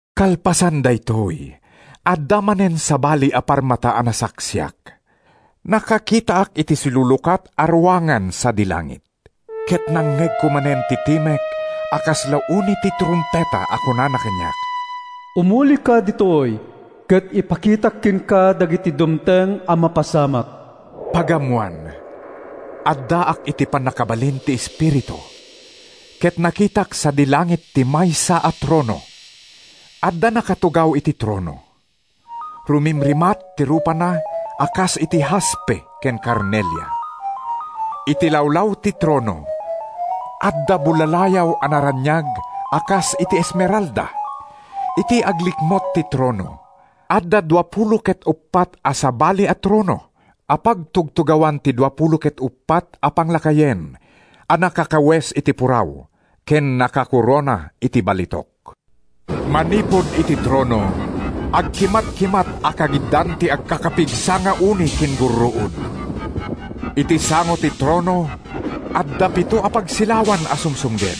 Kalpasan daytoy, adda manen sabali a parmata a nasaksiak. Nakakitaak iti silulukat a ruangan sadi langit. Ket nangngegko manen ti timek a kasla uni ti trumpeta a kunana kaniak: “Umulika ditoy ket ipakitak kenka dagiti dumteng a mapasamak.” Pagammoan, addaak iti pannakabalin ti Espiritu ket nakitak sadi langit ti maysa a trono. Adda nakatugaw iti trono. Rumimatrimat ti rupana a kas iti haspe ken karnelia. Iti lawlaw ti trono, adda bullalayaw a naraniag a kas iti esmeralda. Iti aglikmut ti trono, adda duapulo ket uppat a sabali a trono a pagtugtugawan ti duapulo ket uppat a panglakayen a nakakawes iti puraw ken nakakorona iti balitok. Manipud iti trono, agkimatkimat a kagiddan ti agkakapigsa nga uni ken gurruod. Iti sango ti trono, adda pito a pagsilawan a sumsumged;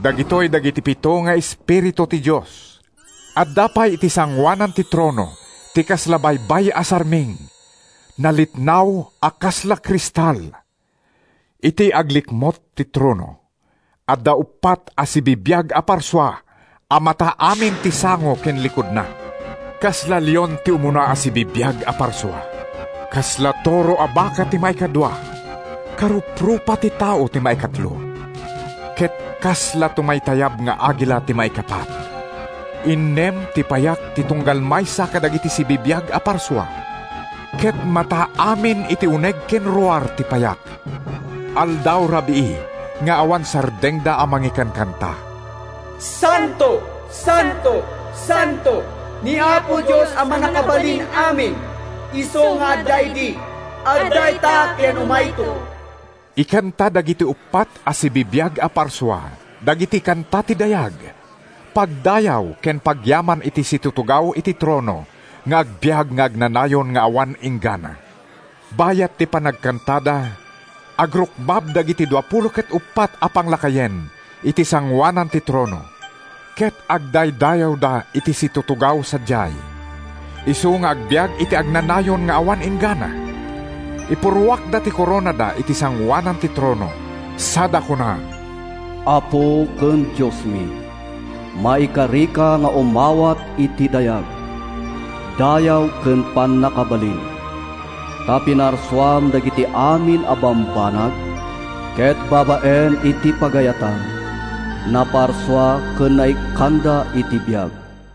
dagitoy dagiti pito nga espiritu ti Dios. Adda pay iti sangoanan ti trono ti kasla baybay a sarming, nalitnaw a kasla kristal. Iti aglikmut ti trono, adda uppat a sibibiag a parsua a mata amin ti sango ken likudda. Kasla leon ti umuna a sibibiag a parsua; kasla toro a baka ti maikadua; karuprupa ti tao ti maikatlo; ket kasla tumaytayab nga agila ti maikapat. Innem ti payak ti tunggal maysa kadagiti sibibiag a parsua, ket mata amin iti uneg ken ruar ti payak. Aldaw-rabii nga awan sardengda a mangikankanta: “Santo, santo, santo, ni Apo Dios a Mannakabalin-amin, Isu nga adda idi, adda ita ken umayto.” Ikanta dagiti uppat a sibibiag a parsua dagiti kanta ti dayag, pagdayaw ken pagyaman iti situtugaw iti trono nga agbiag nga agnanayon nga awan inggana. Bayat ti panagkantada, agrukbab dagiti duapulo ket uppat a panglakayen iti sangoanan ti trono ket agdaydayawda iti situtugaw sadiay, isu nga agbiag iti agnanayon nga awan inggana. Ipurruakda ti koronada iti sangoanan ti trono sada kuna: “Apo ken Diosmi! Maikarika nga umawat iti dayag, dayaw ken pannakabalin. Ta pinarsuam dagiti amin a bambanag, ket babaen iti pagayatam, naparsua ken naikkanda iti biag.”